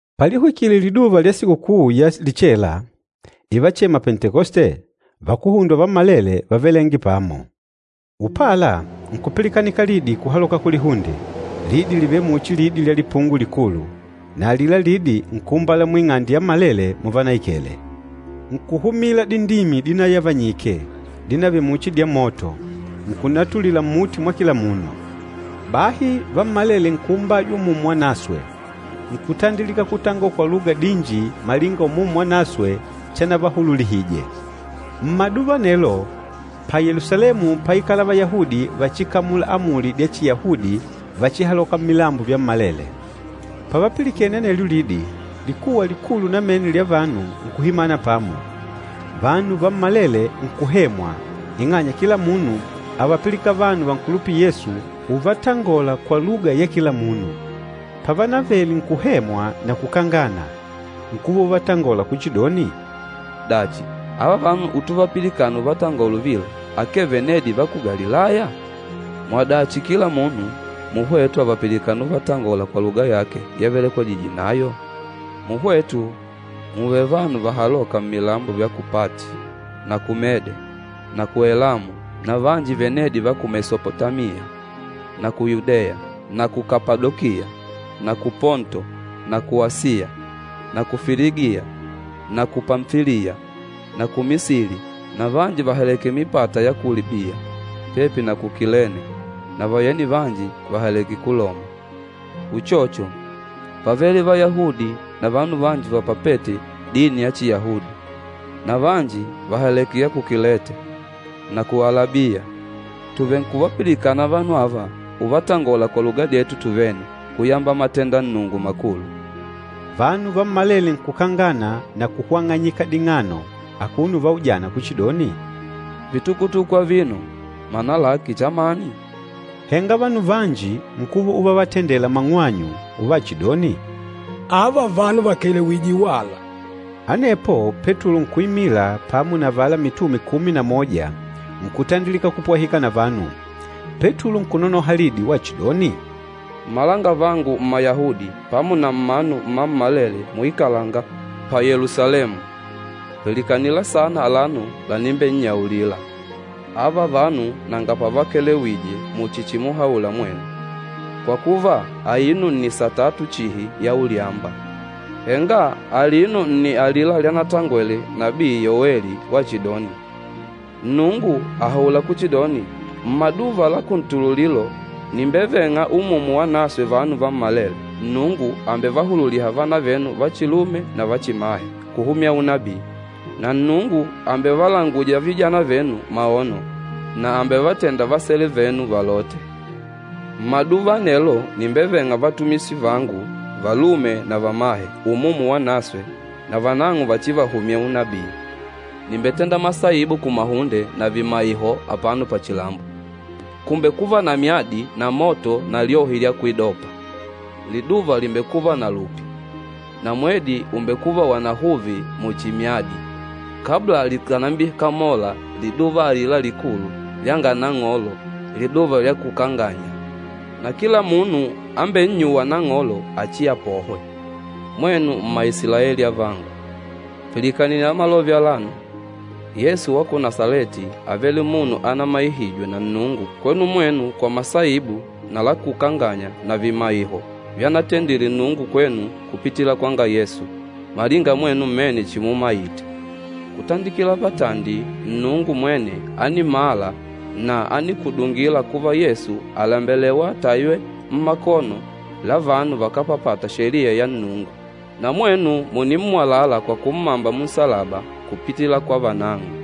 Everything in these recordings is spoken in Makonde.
Palihwikile liduva lya Sikukuu ya Lichela, ivachema Pentekoste, vakuhundwa vammalele vávelenge pamo. Upala nkupilikanika lidi kuhaloka kulihunde, lidi livêle muchi lidi lya lipungo likulu, na alila lidi nkuumbala muing'ande yammalele muvanaikele. Nkuhumila dindimi dinayavanyike, dinavele muchi dya moto, nkunatulila mmuti mwa kila munu. Bahi vammalele nkuumbajwa Umumu Wanaswe, nkutandilika kutangola kwa luga dinji malinga Umumu Wanaswe chanavahululihije. Mmaduva anelo, pa Yelusalemu páikala Vayahudi vachikamula amuli dya Chiyahudi vachihaloka mmilambo vyammalele. Pavapilikene anelyo lidi, likuwa likulu namene lya vanu nkuhimana pamo. Vanu vammalele nkuhemwa, ing'anya kila munu ávapilikana vanu vankulupîla Yesu uvatangola kwa luga ya kila munu. Pavanavele nkuhemwa na kukangana, nkuva uvatangola kuchidoni, “Dachi, ava vanu utuvapilikana uvatangola uvila, akee venedi va ku Galilaya? Mwadachi kila munu muhwetu àvapilikana uvatangola kwa luga yake yavelekwejije nayo? Muhwetu mùùve vanu vahalôka mmilambo vya ku Pati na ku Mede na ku Elamu na vanji venedi va ku Mesopotamiya na ku Yudeya na ku Kapadokiya na ku Ponto na ku Asiya, na ku Filigiya na ku Pamfiliya na ku Misili na vanji vàhaleke mipata ya ku Libiya pepi na ku Kilene, na vayeni vanji vàhaleke ku Loma. Uchocho, pávele Vayahudi na vanu vanji vapapête dini ya Chiyahudi na vanji vàhaleke ya ku Kilete na ku Alabiya. Tuvenkuvapilikana vanu ava uvatangola kwa luga dyetu tuvene kuyamba matenda Nnungu makulu.” Vanu vammalele nkukangana na kuhwang'anyika ding'ano akuno uvaujana kuchidoni, “Vitukutuku avino mana lake chamani?” Henga vanu vanji nkuva uvavatendela mang'wanyu uvachidoni, “Ava vanu vakelewije wala!” Anepo Petulo nkuimila pamo na avala mitume kumi na moja nkutandilika kupwahika na vanu, Petulo nkunonoha lidi wachidoni, “Mmalangavangu Mmayahudi pamo na mmanu mmammalele muikalanga pa Yelusalemu, pilikanila sana alano lanimbennyaulila. Ava vanu nanga pavakelewije muchi chimuhaula mwenu, kwa kuva, aino nni satatu chihi ya ulyamba. Henga alino nni alila lyanatangwele nabii Yoweli wachidoni, ‘Nnungu àhaula kuchidoni, mmaduva la kuntululilo nìmbeveng'a Umumu Wanaswe vanu vammalele. Nnungu àmbevahululiha vana venu vachilume na vachimahe kuhumya unabii, na Nnungu àmbevalanguja vijana venu maono, na àmbevatenda vasele venu valote. Mmaduva anelo, nìmbeveng'a vatumishi vangu, valume na vamahe Umumu Wanaswe, na vanang'o vachivahumye unabii. Nìmbetenda masaibu kumahunde, na vimaiho apano pachilambo, kùmbekuva na myadi na moto na lyohi lya kwidopa. Liduva lìmbekuva na lupi, na mwedi ùmbekuva wanahuvi muchi myadi, kabla likànambikamola liduva alila likulu lyanga Nang'olo, liduva lya kukanganya. Na kila munu ambennyûwa Nang'olo, achiapohwe.’ Mwenu Mmaisilaeli avangu, pilikanila malove alano! Yesu wa ku Nasaleti ávele munu anamaihijwe na Nnungu kwenu mwenu kwa masaibu na lakukanganya na vimaiho vyanatendile Nnungu kwenu kupitila kwanga Yesu, malinga mwenu mmene chimumaite. Kutandikila patandi Nnungu mwene ánimala na ánikudungila kuva Yesu àlembelewa ataywe mmakono la vanu vakápapata Sheliya ya Nnungu, na mwenu mùnimmwalala kwa kummamba munsalaba kupitila kwa vanang'o.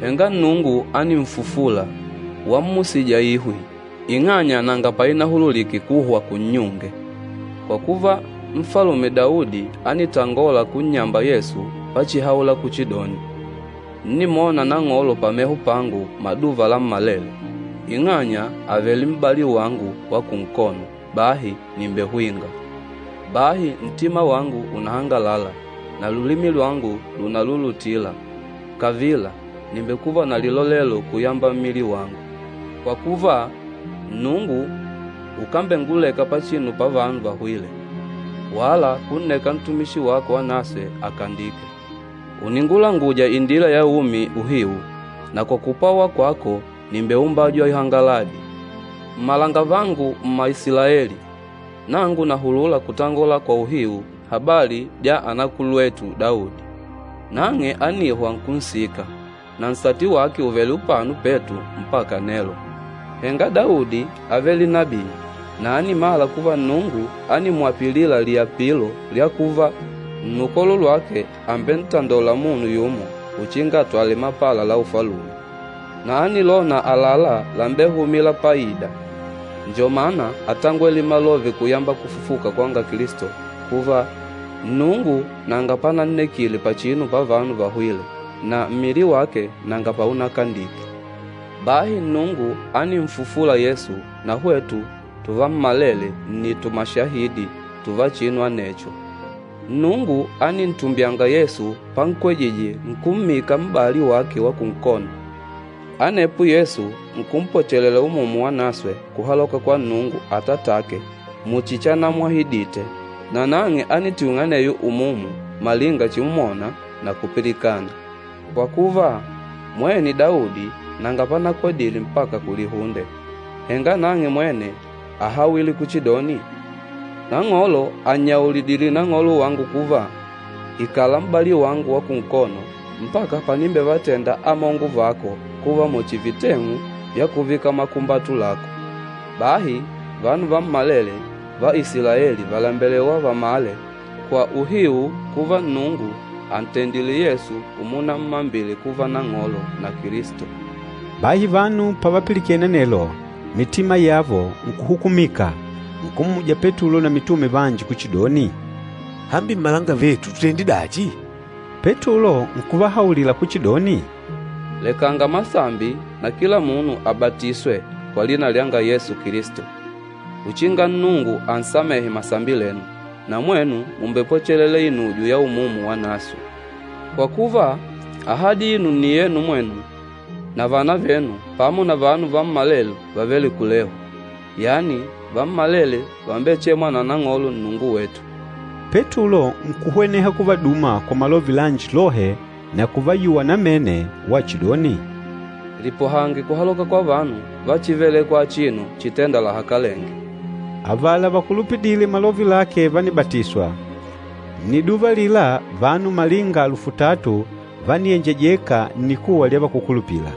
Henga Nnungu ánimfufula, wammusija ihwi, ing'anya nanga painahululike kuhwa kunnyunge. Kwa kuva, Nfalume Daudi ánitangola kunnyamba Yesu pachihaula kuchidoni, ‘Ńnimwona Nang'olo pameho pangu maduva lammalele. Ing'anya àvele m'bali wangu wa kunkono, bahi nìmbehwinga. Bahi ntima wangu unahangalala, na lulimi lwangu lùnalulutila. Kavila, nìmbekuva na lilolelo kuyamba mmili wangu. Kwa kuva, Nnungu ukambenguleka pachinu pavanu vahwîle, wala kunneka ntumishi wako wanaswe akandike. Ùningulanguja indila ya umi uhiu, na kwa kupwawa kwako nìmbeumbajwa ihangaladi!’ Mmalangavangu Mmaisilaeli, nangu nàhulula kutangola kwa uhiu habali dya anakulwetu Daudi. Nang'e ánihwa nkunsika, na nsati wake ùvele upano petu mpaka nelo. Henga Daudi ávele nabii na ánimala kuva Nnungu ánimwapilila liapilo lya kuva, nnukolo lwake àmbentandola munu yumo uchinga atwale mapala la ufalume. Na ánilona àlalá lambehumîla paida, njo mana átangwele malove kuyamba kufufuka kwanga Kilisto kuva, ‘Nnungu nanga panannekile pachinu pavanu vahwîle na mmili wake nanga paunakandike.’ Bahi Nnungu ánimfufula Yesu, na hwetu tuvammalele nni tumashahidi tuva chinu anecho. Nnungu ánintumbyanga Yesu pankwejije nkummika m'bali wake wa kunkono. Anepo Yesu nkumpwachelela Umumu Wanaswe kuhaloka kwa Nnungu Atatake muchi chanamwahidite. Na nang'e ánitwing'a aneyo Umumu malinga chimwona na kupilikana. Kwa kuva, mwene Daudi nanga panakwedile mpaka kulihunde, henga nang'e mwene áhawile kuchidoni, ‘Nang'olo ànnyaulidile Nang'olo wangu kuva, “Ikala m'bali wangu wa kunkono, mpaka panimbevatenda amongo vako kuva muchi viteng'u vya kuvika makumbatu lako.” ’ Bahi vanu vammalele va Isilaeli vàlembelewa vamale kwa uhiu kuva Nnungu àntendile Yesu umunammambile kuva Nang'olo na Kilisto.” Bahi vanu pavapilikene anelo, mitima yavo nkuhukumika, nkummuja Petulo na mitume vanji kuchidoni, “Hambi, mmalangavetu tutende dachi?” Petulo nkuvahaulila kuchidoni, “Lekanga masambi na kila munu abatiswe kwa lina lyanga Yesu Kilisto, uchinga Nnungu ansamehe masambi lenu. Na mwenu mùmbepwechelela inujo ya Umumu Wanaswe. Kwa kuva, ahadi aino nni yenu mwenu na vana venu pamo na vanu vammalele vàvele kulehu, yani vammalele vàmbechemwa na Nang'olo Nnungu wetu.” Petulo nkuhweneha kuvaduma kwa malove lanji lohe na kuvayuwa namene wachidoni, “Lipohange kuhaloka kwa vanu va chívelèkwà achino chitênda lahakalenge.” Avala vakulupidîle malove lake vánibatiswa, nniduva alila vanu malinga alufu tatu vániyenjejeka nnikuwa lya vakúkulupila.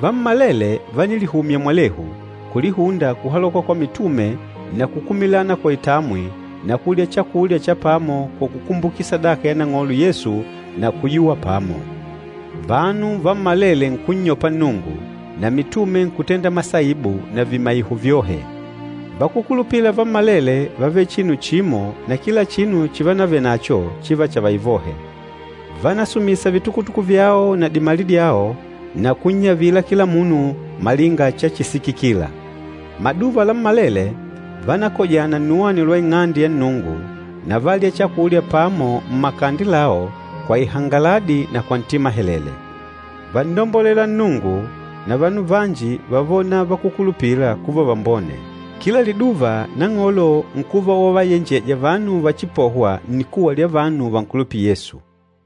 Vammalele vánilihumya mwalehu, kulihunda kuhaloka kwa mitume na kukumilana kwa itamwi na kulya chakulya cha pamo kwa kukumbukila sadaka ya Nang'olo Yesu na kuyuwa pamo. Vanu vammalele nkunnyopa Nnungu, na mitume nkutenda masaibu na vimaiho vyohe. Vakúkulupila vammalele vávele chinu chimo na kila chinu chivanavenacho chiva chavaivohe. Vánasumisa vitukutuku vyao na dimali dyao na kunnyavila kila munu malinga chachisikikila. Maduva lammalele vánakojana nnuwani lwa Ing'ande ya Nnungu, na válya chakulya pamo mmakande lao kwa ihangaladi na kwa ntima helele. Vánnombolela Nnungu, na vanu vanji vávona vakúkulupila kuva vambone. Kila liduva Nang'olo nkuva wavayenjeja vanu vachipohwa, nnikuwa lya vanu vankulupîla Yesu.